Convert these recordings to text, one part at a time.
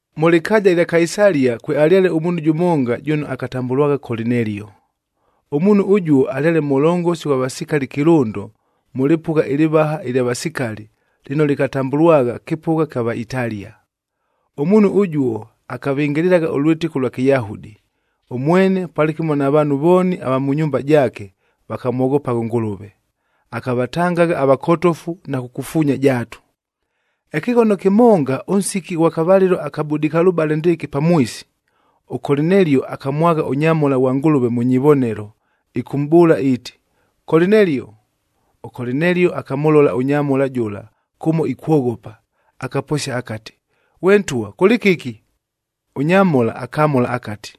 Mʉ lɨkaaja ɨlya Kaisalia kwealyale ʉmuunhu jʉmonga jʉno akatambʉlwagha Kolinelio. Ʉmuunhu ʉjuo alyale mʉlongosi ghwa vasikali kɨlʉndo mʉ lɨpʉgha ɨlɨvaha ɨlya vasikali, lɨno lɨkatambʉlwagha kɨpʉgha kya Vaitalia. Ʉmuunhu ʉjuo akavɨngɨlɨlagha ʉlwɨtɨko ʉlwa Kɨyahudi, ʉmwene palɨkɨmo na vaanhu vooni ava mʉ nyumba jaake vakamwoghopagha ʉNgʉlʉve. Akavatangagha avakotofu na kukufuunya jaatu. Ɨkɨghono kɨmonga, ʉnsiki ʉghwa kavalɨlo aka budikalʉbale ndɨɨkɨ pamwisi, ʉKolinelio akamwagha ʉnyamhola ghwa Ngʉlʉve mʉ nyivonelo, ɨkʉmʼbʉʉla iiti, “Kolinelio!” ɄKolinelio akamʉlola ʉnyamhola jʉla kʉmo ikwoghopa, akaposia akati, “Ghwe ntwa kʉlɨ kɨki?” Ʉnyamhola akamʉla akati,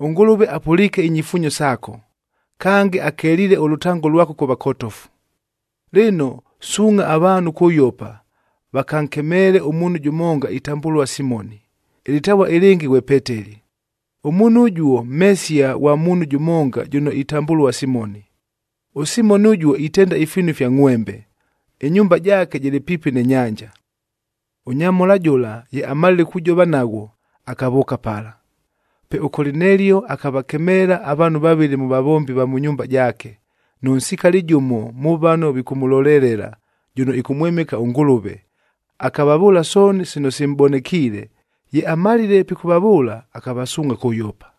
“ɄNgʉlʉve apʉliike inyifuunyo saako, kange akeliile ʉlʉtango lwako kʉ vakotofu. Lɨno, suungʼha avaanhu kʉ Yopa, vakankemeele ʉmuunhu jʉmonga itambʉlua Simoni, ɨlɨtavua ɨlɨngɨ ghwe Peteli. Ʉmuunhu ʉjuo mhesia ghwa muunhu jʉmonga jʉno itambʉlua Simoni. ɄSimoni ʉjuo itenda ifiinu ifya ngʼhwembe, ɨnyumba jaake jɨlɨ piipi nɨ nyanja.” Ʉnyamhola jʉla ye amalile kujova naghwo, akavʉʉka pala. Pe ʉKolinelio akavakemeela avaanhu vavɨlɨ mʉ vavombi va mʉ nyumba jaake, nʉ nsikali jʉmo mʉ vano vikʉmʉlolelela, jʉno ɨkʉmwɨmɨka ʉNgʉlʉve, akavavʉʉla sooni sino simʼbonekiile. Ye amalile pikʉvavʉʉla, akavasuungʼha kʉ Yopa.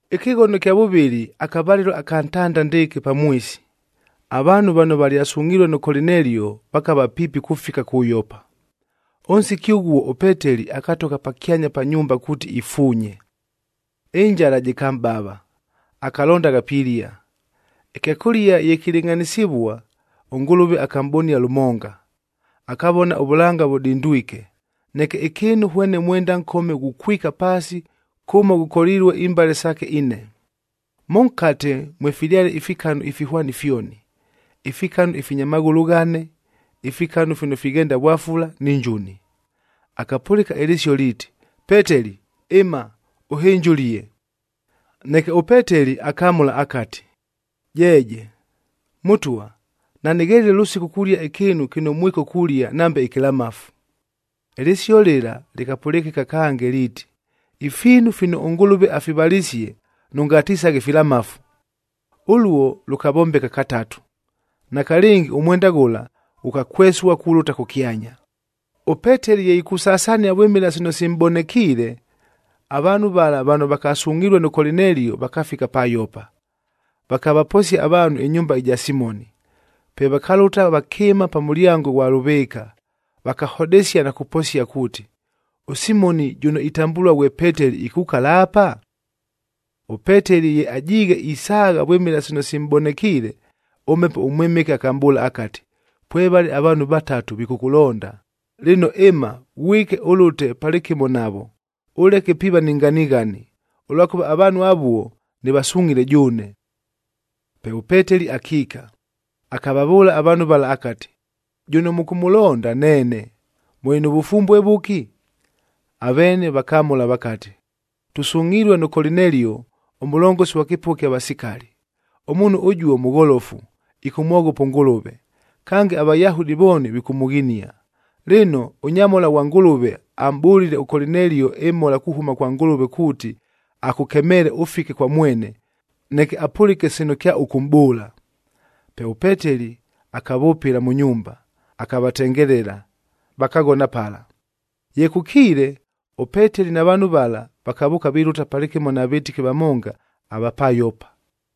Ɨkɨghono ɨkya vʉvɨlɨ akavalɨlo aka ntanda ndɨɨkɨ pamwisi, avaanhu vano valyasungʼhilue nʉ Kolinelio vakava piipi kufika kʉ Yopa. Ʉnsiki ʉghuo ʉPeteli akatogha pakyanya pa nyumbaa kuuti ifuunye. Ɨnjala jɨkamʼbava, akalondagha pilia. Ɨkyakʉlia ye kilɨngʼhanɨsɨvua, ʉNgʉlʉve akamʼbonia lʉmonga. Akavona ʉvʉlanga vʉdindwike, neke ɨkɨɨnu hwene mwenda nkome ghukwika paasi kʉmo ghʉkolilue imbale saake ine. Mʉnkate mwefilyale ifikanu ifihwani fyoni:b ifikanu ifinya maghʉlʉ ghane, ifikanu fino fighenda vwafula ni njuni. Akapʉlɨka ɨlɨsio liiti, “Peteli ɨma, ʉhɨnje ʉlie!” Neke ʉPeteli akamʉla akati, “Jeeje! Mʉtwa, nanɨghelile lʉsiku kulia ɨkɨɨnu kɨno mwiko kulia nambe ɨkɨlamafu.” Ɨlɨsio lɨla lɨkapʉlɨkɨka kange liiti, “Ifiinu fino ʉNgʉlʉve afivalisie, nʉngatisaghe filamafu.” Ʉluo lʉkavombeka katatu. Nakalɨngi ʉmwenda ghʉla ghʉkakwesua kulʉta kʉkyanya. ɄPeteli ye ikusasania vwɨmɨla sino simʼbonekiile, avaanhu vala vano vakasungʼhilue nʉ Kolinelio, vakafika pa Yopa, vakavaposia avaanhu ɨnyumba ɨja Simoni. Pe vakalʉta vakɨɨma pa mʉlyango ʉghwa lʉvɨɨka, vakahodesia na kuposia kuuti, “ɄSimoni jʉno itambʉlua ghwe Peteli ikukala apa?” ɄPeteli ye ajiighe isaagha vwɨmɨla sino simʼbonekiile, ʉMhepo ʉMwɨmɨke akamʼbʉʉla akati, “Pwevale avaanhu vatatu vikʉkʉlonda. Lɨno, ɨma, ghwike, ʉlʉte palɨkɨmo navo, ʉleke piiva ni nganighani, ʉlwakʉva avaanhu avuo nɨvasungʼhile jʉʉne.” Pe ʉPeteli akiika, akavavʉʉla avaanhu vala akati, “Jʉno mʉkʉmʉlonda, neene. Mʉlɨ nʉ vʉfumbue vʉki?” Aveene vakamʉla vakati, “Tʉsungʼhilue nʉ Kolinelio ʉmʉlongosi ghwa kɨpʉgha ɨkya vasikali. Ʉmuunhu ʉjuo mʉgholofu, ɨkʉmwoghopa ʉNgʉlʉve, kange aVayahudi vooni vikʉmʉghinia. Lɨno, ʉnyamhola ghwa Ngʉlʉve amʼbʉlile ʉKolinelio ɨmhola kuhʉma kwa Ngʉlʉve kuuti akʉkemeele ʉfike kwa mwene, neke apʉlɨke sino kyaʉkʉmʼbʉʉla.” Pe ʉPeteli akavʉpɨla mʉ nyumba, akavatengelela, vakaghona pala. Ye kʉkiile, ʉPeteli na vaanhu vala, vakavʉʉka vilʉta palɨkɨmo na vɨtɨki vamonga ava pa Yopa.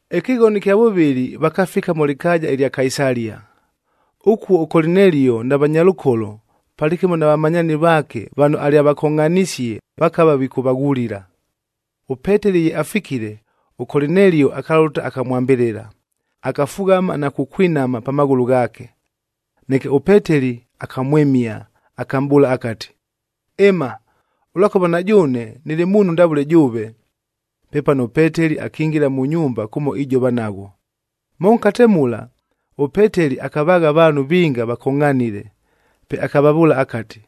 Ɨkɨghono ɨkya vʉvɨlɨ vakafika mʉ lɨkaaja ɨlya Kaisalia. Ʉkuo ʉKolinelio na vanyalʉkolo, palɨkɨmo na vamanyaani vaake vano alyavakongʼhanisie vakava vikʉvaghulila. ɄPeteli ye afikile, ʉKolinelio akalʉta akamwambɨlɨla, akafughama na kukwinama pa maghʉlʉ ghaake. Neke ʉPeteli akamwɨmia, akamʼbʉʉla akati, “Ɨma, ʉlwakʉva na jʉʉne nɨlɨ muunhu ndavʉle jʉʉve.” Pepano ʉPeteli akingila mʉ nyumba kʉmo ijova naghwo. Mʉnkate mula, ʉPeteli akavaagha avaanhu vinga vakongʼhanile. Pe akavavʉʉla akati,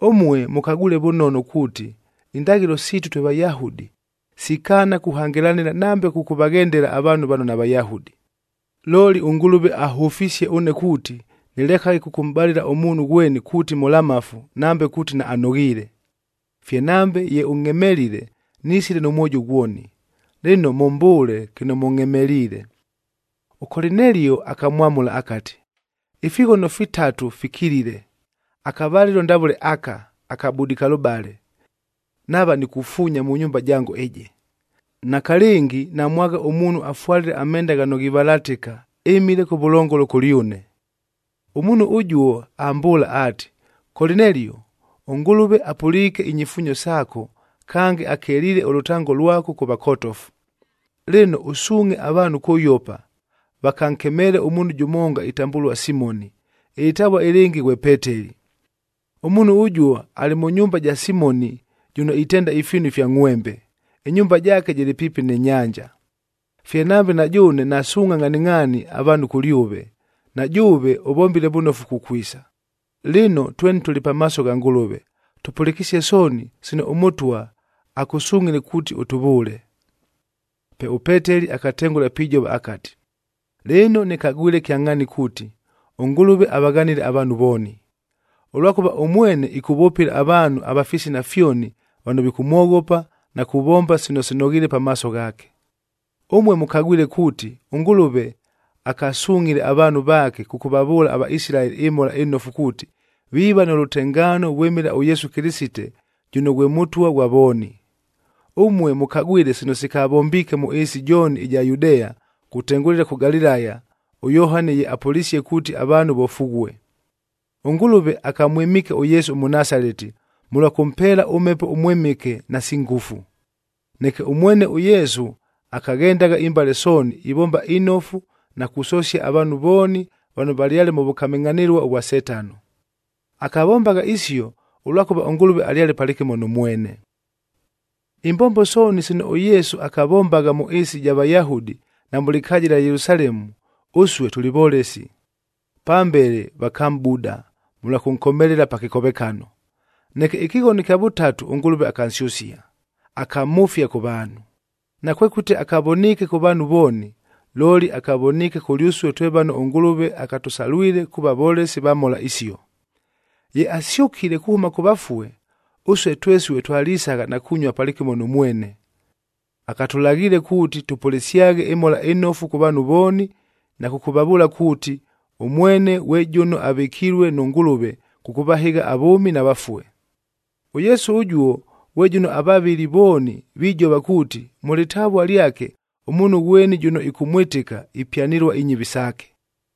“Ʉmue mʉkagwile vʉnono kuuti, indaghɨlo siitu twe Vayahudi sikaana kuhangɨlanɨla nambe kʉkʉvaghendela avaanhu vano naVayahudi. Looli ʉNgʉlʉve ahʉfisie ʉne kuuti, nɨlekaghe kʉkʉmʼbalɨla ʉmuunhu ghweni kuuti mʉlamafu, nambe kuuti naanoghiile. Fye nambe ye ʉngʼhemelile, nisile nʉ mwojo ghwoni. Lɨno, mʉmbʉʉle kɨno mʉngʼhemeliile.” ɄKolinelio akamwamʉla akati, “Ifighono fitatu fikilile, akavalɨlo ndavʉle aka, aka budikalʉbale, nava nikufuunya mʉ nyumba jango ɨjɨ. Nakalɨngi namwagha ʉmuunhu afwalile amenda ghano ghivalatɨka, ɨmile kʉvʉlongolo kʉlyʉne. Ʉmuunhu ʉjuo ambʉʉla aati, ‘Kolinelio! ɄNgʉlʉve apʉliike inyifuunyo saako kange akeliile ʉlʉtango lwako kʉ vakotofu. Lɨno, ʉsuungʼhe avaanhu kʉ Yopa vakankemeele ʉmuunhu jʉmonga itambʉlua Simoni, ɨlɨtavua ɨlɨngɨ ghwe Peteli. Ʉmuunhu ʉjuo alɨ mʉ nyumba ɨja Simoni jʉno itenda ifiinu ifya ngʼhwembe, ɨnyumba jaake jɨlɨ piipi nɨ nyanja.’ Fye nambe na jʉʉne nasuungʼha ngʼhaningʼhaani avaanhu kʉlyʉve, na jʉʉve ʉvombile vʉnofu kukwisa. Lɨno, tweni tʉlɨ pamaaso gha Ngʉlʉve, tʉpʉlɨkɨsie sooni sino ʉMʉtwa akʉsungʼhile kuuti ʉtʉvʉʉle.” Pe ʉPeteli akatengʉla pijova akati, “Lɨno nɨkagwile kyangʼhaani kuuti, ʉNgʉlʉve avaghanile avaanhu vooni. Ʉlwakʉva ʉmwene ɨkʉvʉpɨla avaanhu ava fisina fyoni vano vikʉmwoghopa, na kuvomba sino sinoghiile pamaaso ghaake. Ʉmue mʉkagwile kuuti ʉNgʉlʉve akasungʼhile avaanhu vaake kʉkʉvavʉʉla aVaisilaeli ɨMhola ɨNofu kuuti, viiva nʉ lʉtengaano vwɨmɨla ʉYesu Kɨlɨsite jʉno ghwe Mʉtwa ghwa vooni. Ʉmue mʉkagwile sino sikavombiike mʉ ɨɨsi jooni ɨja Yudea kutengʉlɨla kʉ Galilaya, ʉYohani ye apʉlisie kuuti avaanhu vofughue. ɄNgʉlʉve akamwɨmiike ʉYesu ʉMʉnasaleti, mʉlwa kʉmpeela ʉMhepo ʉMwɨmɨke nasi ngʉfu. Neke ʉmwene ʉYesu akaghendagha imbale sooni, ivomba inofu na kusosia avaanhu vooni vano valyale mʉ vʉkamɨngʼhanɨlua vwa Setano. Akavombagha isio, ʉlwakʉva ʉNgʉlʉve alyale palɨkɨmo nʉ mwene. “Imbombo sooni sino ʉYesu akavombagha mʉ ɨɨsi ɨja Vayahudi na mʉ lɨkaaja ɨlya Yelusalemu, ʉsue tʉlɨ volesi. Pambele vakamʼbuda mʉlwa kʉnkomelela pa kɨkovekano. Neke ɨkɨghono ɨkya vʉtatu ʉNgʉlʉve akansyʉsia, akamhʉfia kʉ vaanhu. Nakwekʉti akavoniike kʉ vaanhu vooni, looli akavoniike kʉlyʉsue twe vano ʉNgʉlʉve akatʉsalwile kuuva volesi va mhola isio. Ye asyʉkile kuhʉma kʉ vafue, ʉsue twesue twalisagha na kunyua palɨkɨmo nʉ mwene. Akatʉlaghiile kuuti tʉpʉlɨsyaghe ɨMhola ɨNofu kʉ vaanhu vooni na kʉkʉvavʉʉla kuuti, ʉmwene ghwe jʉno avɨkilue nʉ Ngʉlʉve kʉkʉvahɨgha avʉʉmi na vafue. ɄYesu ʉjuo ghwe jʉno avavɨli vooni vijova kuuti, mʉ lɨtavua lyake ʉmuunhu ghweni jʉno ɨkʉmwɨtɨka, ipyanɨlua inyɨvi saake.”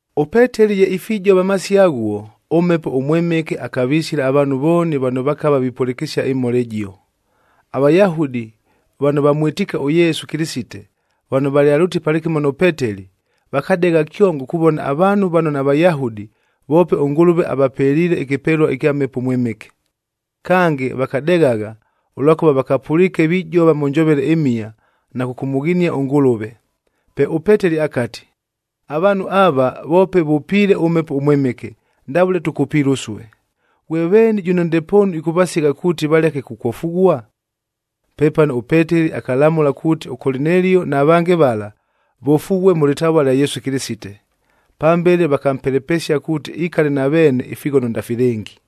ɄPeteli ye ifijova amasio aghuo, ʉMhepo ʉMwɨmɨke akavisila avaanhu vooni vano vakava vipʉlɨkɨsia ɨmhola ɨjio. AVayahudi vano vamwɨtiike ʉYesu Kɨlɨsite vano valyalʉtile palɨkɨmo nʉ Peteli, vakadegha kyongo kuvona avaanhu vano naVayahudi voope ʉNgʉlʉve avapeliile ɨkɨpelua ɨkya Mhepo ʉMwɨmɨke. Kange vakadeghagha, ʉlwakʉva vakavapʉliike vijova mʉ njovele ɨmhia na kʉkʉmʉghinia ʉNgʉlʉve. Pe ʉPeteli akati, “Avaanhu ava voope vʉpiile ʉMhepo ʉMwɨmɨke ndavʉle tʉkʉpiile ʉsue. Ghwe veeni jʉno ndepoonu ɨkʉvasigha kuuti valeke kukwofughua?” Pepano ʉPeteli akalamʉla kuuti ʉKolinelio na vange vala, vofughue mʉ lɨtavua lya Yesu Kɨlɨsite. Pambele vakampelepesia kuuti ikale na veene ifighono ndafilɨngi.